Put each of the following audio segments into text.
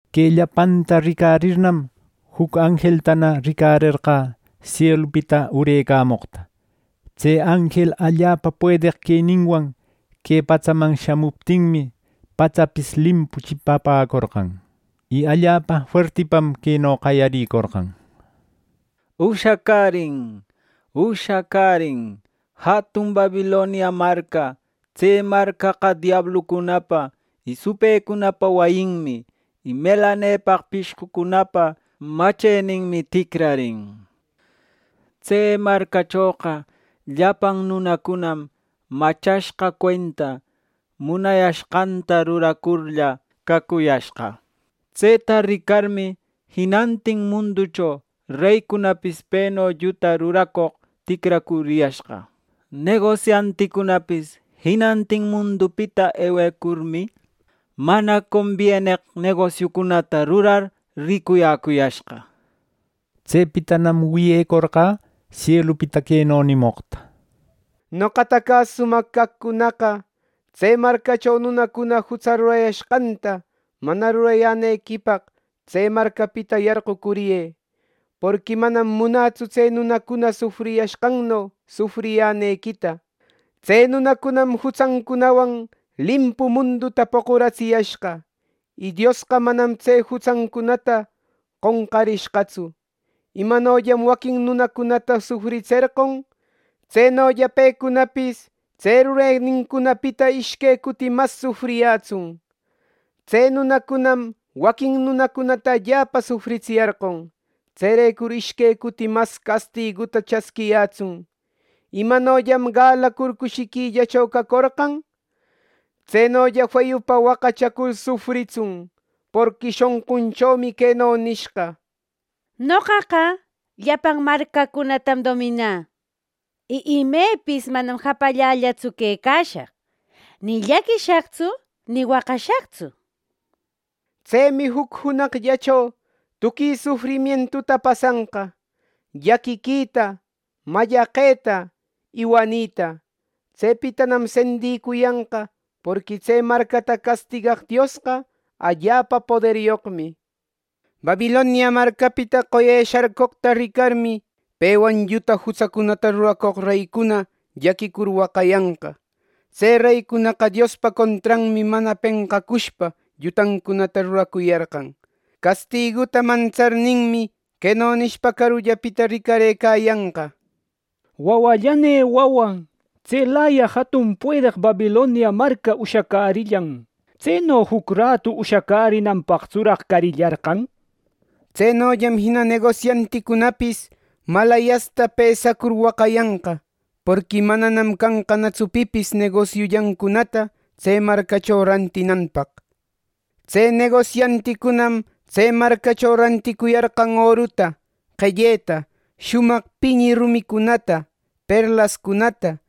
Que llapanta ricarirnam, juc anjeltana ricarerqä sielupita urecamoqta. Tse anjel allapa puedeq queninwan que patsaman shamuptinmi, patsapis limpu chipapäcorqan. Y allapa fuertipam queno qayarïcorqan: “Ushacärin, ushacärin jatun Babilonia marca. Tse marcaqa diablucunapa y supëcunapa wayinmi, y melanepaq pishqucunapa macheninmi ticrarin. Tse marcachoqa llapan nunacunam machashqa cuenta munayashqanta ruracurlla cacuyashqa. Tseta ricarmi, jinantin munducho reycunapis peno lluta ruracoq ticracuriyashqa. Negosianticunapis jinantin mundupita ewecurmi, mana combieneq negosiucunata rurar ricuyäcuyashqa” nir. Tsepitanam wiyecorqä sielupita queno nimoqta: “Noqata cäsumaq caqcunaqa tse marcacho nunacuna jutsa rurayashqanta mana rurayänequipaq tse marcapita yarqucuriyë; porqui manam munätsu tse nunacuna sufriyashqanno, sufriyänequita. Tse nunacunam jutsancunawan limpu munduta poquratsiyashqa, y Diosqa manam tse jutsancunata qonqarishqatsu. Imanollam waquin nunacunata sufritserqon, tsenolla pecunapis tse rurenincunapita ishque cuti mas sufriyätsun. Tse nunacunam waquin nunacunata allapa sufritsiyarqon. Tserecur ishque cuti mas castiguta chasquiyätsun. Imanollam galacur cushiquillacho cacorqan. Tsenolla feyupa waqachacur sufritsun. Porqui shonqunchomi queno nishqa ‘Noqaqa llapan marcacunatam dominä, y imepis manam japallallatsu quecashaq ni llaquishaqtsu ni waqashaqtsu’ nir. Tsemi juc junaqllacho tuqui sufrimientuta pasanqa, llaquiquita, mallaqeta, y wanita. Tsepitanam sendïcuyanqa; porqui tse marcata castigaq Diosqa, allapa poderyoqmi” nir. Babilonia marcapita qoye sharcoqta ricarmi, pewan lluta jutsacunata ruracoq reycuna llaquicur waqayanqa. Tse reycunaqa Diospa contranmi mana penqacushpa llutancunata ruracuyarqan. Castiguta mantsarninmi queno nishpa carullapita ricarëcayanqa: “¡Wawallanï, wawä! Tselaya jatun puedeq Babilonia marca ushacärillan. ¿Tseno juc ratu ushacärinanpaqtsuraq carillarqan!” nir. Tsenollam jina negosianticunapis maläyasta pesacur waqayanqa. Porqui mananam canqanatsu pipis negosiullancunata tse marcacho rantinanpaq. Tse negosianticunam tse marcacho ranticuyarqan oruta, qelleta, shumaq piñi rumicunata, perlascunata,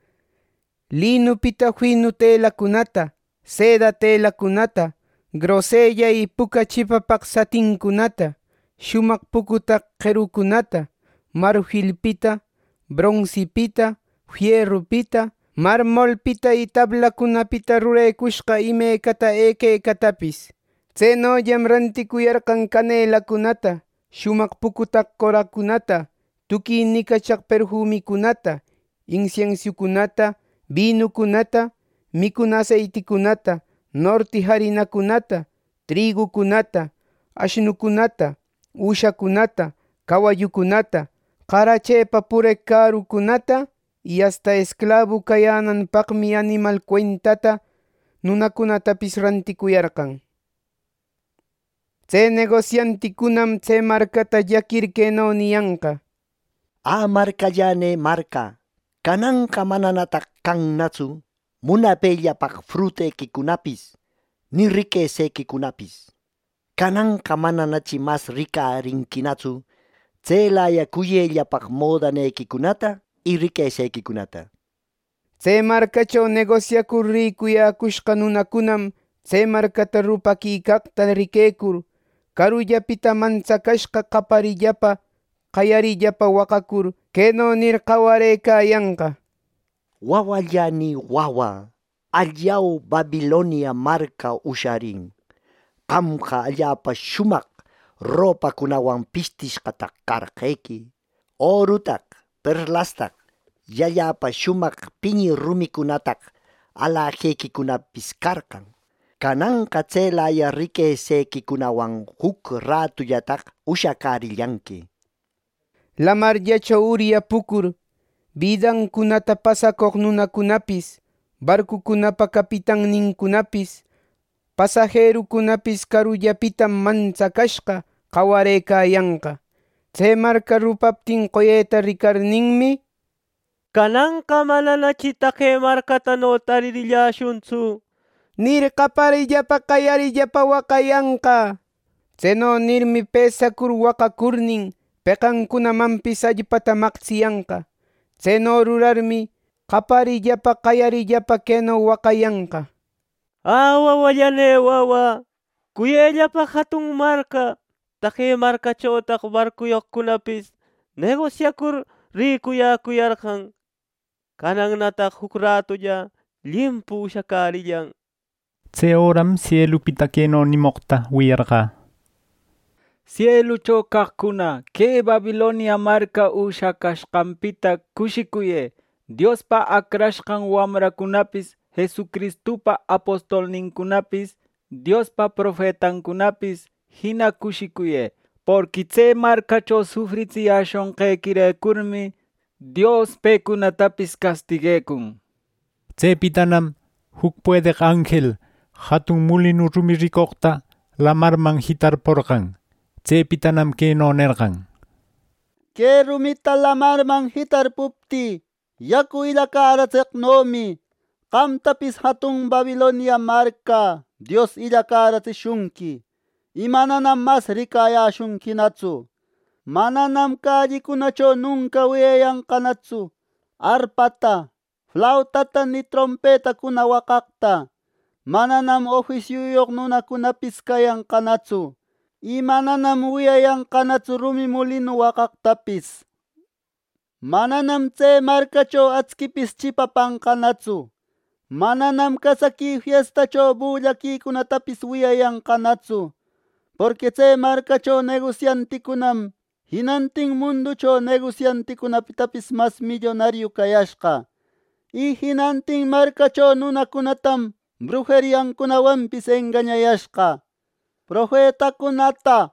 linupita finu telacunata, seda telacunata, grosella y puca chipapaq satincunata, shumaq pucutaq qerucunata, marfilpita, bronsipita, fierupita, marmolpita y tablacunapita rurecushqa imecata equecatapis. Tsenollam ranticuyarqan canelacunata, shumaq pucutaq qoracunata, tuqui nicachaq perfumicunata, insiensiucunata, binucunata, micuna aseiticunata, norti jarinacunata, trigucunata, ashnucunata, üshacunata, cawallucunata, qarachepa pureq cärucunata. Y asta esclabu cayänanpaqmi animal cuentata nunacunatapis ranticuyarqan. Tse negosianticunam tse marcata llaquir queno niyanqa: “¡Ä marcallanï marca, cananqa mananataq cannatsu munapellapaq frutequicunapis ni riquesequicunapis! ¡Cananqa mananachi mas ricarinquinatsu tselaya cuyellapaq modanequicunata y riquesequicunata!” nir. Tse marcacho negosiacur ricuyäcushqa nunacunam tse marcata rupaquicaqta riquecur, carullapita mantsacashqa qaparillapa qayarillapa waqacur, queno nir qawarëcayanqa: “¡Wawallanï wawä! ¡Allau! Babilonia marca ushacärin. Qamqa allapa shumaq ropacunawan bistishqataq carqequi; orutaq, perlastaq y allapa shumaq piñi rumicunataq alajequicunapis carqan. Cananqa tselaya riquesequicunawan juc ratullataq ushacärillanqui” nir. Lamarllacho uryapucur, bidancunata pasacoq nunacunapis, barcucunapa capitannincunapis, pasajerucunapis carullapitam mantsacashqa qawarëcayanqa. Tse marca rupaptin qoyeta ricarninmi, “Cananqa mananachi taqe marcatano taririlläshuntsu” nir, qaparillapa qayarillapa waqayanqa. Tseno nirmi, pesacur waqacurnin, peqancunamanpis allpata maqtsiyanqa. Tseno rurarmi, qaparillapa qayarillapa queno waqayanqa: “¡Ä wawallane wawa, cuyellapaq jatun marca! Taqe marcachotaq barcuyoq nunacunapis negosiacur ricuyäcuyarqan. Canannataq juc rätulla limpu ushacärillan” nir. Tse öram sielupita queno nimoqta wiyarqä: “Sielucho caqcuna, que Babilonia marca ushacashqanpita cushicuyë; Diospa acrashqan wamrancunapis, Jesucristupa apostolnincunapis, Diospa profetancunapis, jina cushicuyë. Porqui tse marcacho sufritsiyäshonqequirecurmi, Dios pecunatapis castiguecun” nir. Tsepitanam juc puedeq anjel jatun mulinu rumi ricoqta lamarman jitarporqan. Tsepitanam queno nerqan: “Que rumita lamarman jitarpuptï, yacu illacäratseqnomi, qamtapis Dios jatun Babilonia marca illacäratsishunqui, y mananam mas ricayäshunquinatsu. Mananam calliquicunacho nunca wiyayanqanatsu arpata, flautata ni trompetacuna waqaqta. Mananam ofisiuyoq nunacunapis cayanqatsu. Y mananam wiyayanqanatsu rumi mulinu waqaqtapis. Mananam tse marcacho actsipis chipapanqanatsu. Mananam casaqui fiestacho bullaquicunatapis wiyayanqanatsu; porqui tse marcacho negosianticunam jinantin munducho negosianticunapitapis mas millonariu cayashqa, y jinantin marcacho nunacunatam brujeriancunawanpis engañashqa” nir. Profetacunata,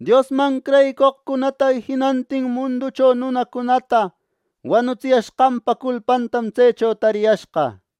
Diosman creyicoqcunata y jinantin munducho nunacunata wanutsiyashqanpa culpantam tsecho tariyashqa.